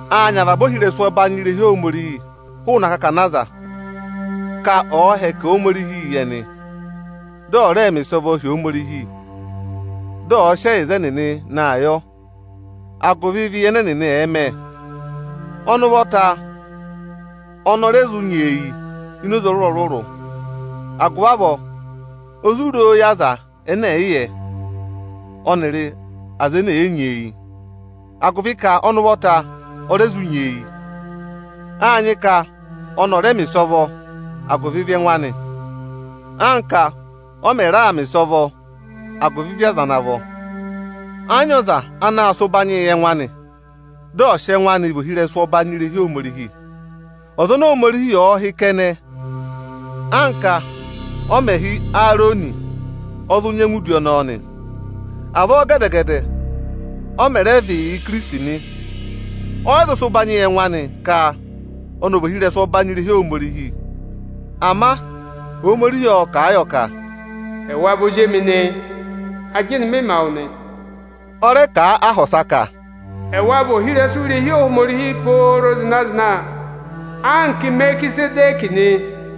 Aā nyị avaba ohirẹsụ ọbanyị irehi Ohomorihi hụụnị akakana aza, ka ọ̀ọ hẹkẹ Ohomorihii yị ẹnị. Dị ọ̀ rẹẹ mẹ ịsọvọọ hi Ohomorihi, dị ọ̀ọ sị ẹyịza ẹnịnị naa yọ agụvị ịvị ẹnẹ ẹnị ẹ̀ẹ mẹ. Ọnị ụvọta ọnị ọ rẹ zụ nyeeyi ini oze ọrụrụ-ọrụrụ, agụvị avọọ o zụ roo yị aza ẹnẹ ẹ̀ yị yẹ, ọnịrị aza ene ee nyeeyi. Agụvị ka ọnị ụvọta o re zụ nyeeyi, áa nyị ka ọnị ọ̀ rẹẹ mẹ̀ ịsọvọ agụvị ịvị ẹngụ anị, anka ọ mẹ̀ raa mẹ̀ ịsọvọ agụvị ịvị aza ana vọ. Ẹ́ yị nyị ọza anaā sị udi ụbanyịị yị ẹngụ anị, dị ọ sị ẹngụ anị vị ohirẹsụ ọbanyị irehi Ohomorihi. Ọza oni Ohomorihi ọ̀ọ hị́ kẹnẹ, anka ọ mẹ̀ hị́ Eerọnị, ọ zụ nyẹngụ yà udi ọnọọ nị. Avọọ gẹdẹ-gẹdẹ ọ mẹ̀ rẹ vị yị Ikirisiti nị. Ọ́ yị sị ụbanyị yị ẹngụ anị ka ọnị ọ̀ vị ohirẹsụ ọbanyị irehi Ohomorihi. Ama Ohomorihi ọ́ kà a yọ ka: Ẹwa vị Ozi emi nị, ajịnị mị ma wụ nị. Ọ́ rẹ kà a áha ọsa ka: Ẹwa vị ohirẹsụ irehi Ohomorihi pooro zịna-zịna anka Imerikizẹdẹkị nị.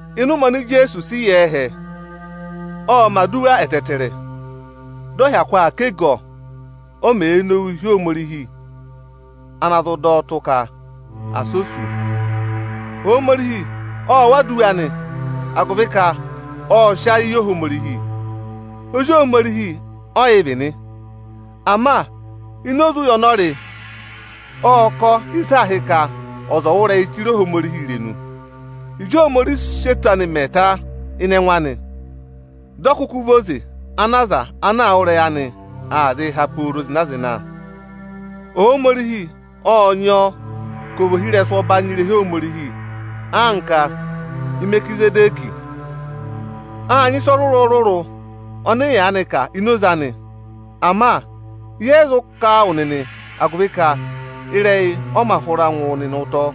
Ịnị ụmẹ oni Ijeesu sị yà ẹhẹ, ộ mẹ̀ aduwa ẹtẹẹtẹrẹ, dị ọ hyakụ aa ká ẹgọ, o mèe nowuu hị́ Ohomorihi ana zụ dọ ọ tụ ka asị ọ sú, Ohomorihi ộ wụ́ aduwa anị agụvị ka ộ sị ayị yị Ohomorihi. Ozi Ohomorihi ọ yị vị nị, ama ini oze ụya ọnị ọ rị, ộ kọ ịsị aā hị́ ka ọza ọ̀ wụ́ ịrẹyị chire Ohomorihi irenu. Ịjị Ohomorihi sị Ijeesu mẹ ka ọ gụ, dị Ijeesu kụkụ vị oze ana aza ana wụ́ ịrẹyị anị aa zịị há pooro zịna-zịna. Ohomorihi ộ nyị ọọ ka ọ̀ vị ohirẹsụ ọbanyị irehi Ohomorihi anka Imerikizẹdẹkị. Áa nyị ịsa ọrụrụ-ọrụrụ ọnị ị yaanị kà ini oze anị. Ama yẹ yị zụ kà a wụ nịnị, agụvị ka ịrẹyị ọ mā hụra ngụ wụ nịnị ụtọ.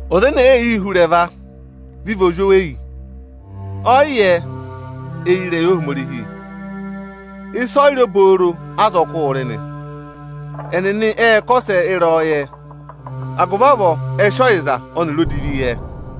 Ọza ene èe yii hú ịrẹva, vị vị ozweyi; ọọ̀ yị yẹ eyi ịrẹyị Ohomorihi. Ịsa ọyịrị obooro ázọkụụ̄ rị nị. Ẹnịnị ệ kọsẹ ịrẹyọyẹ, agụvị avọọ ẹ sị ọyịza ọnịrị odivi yẹ.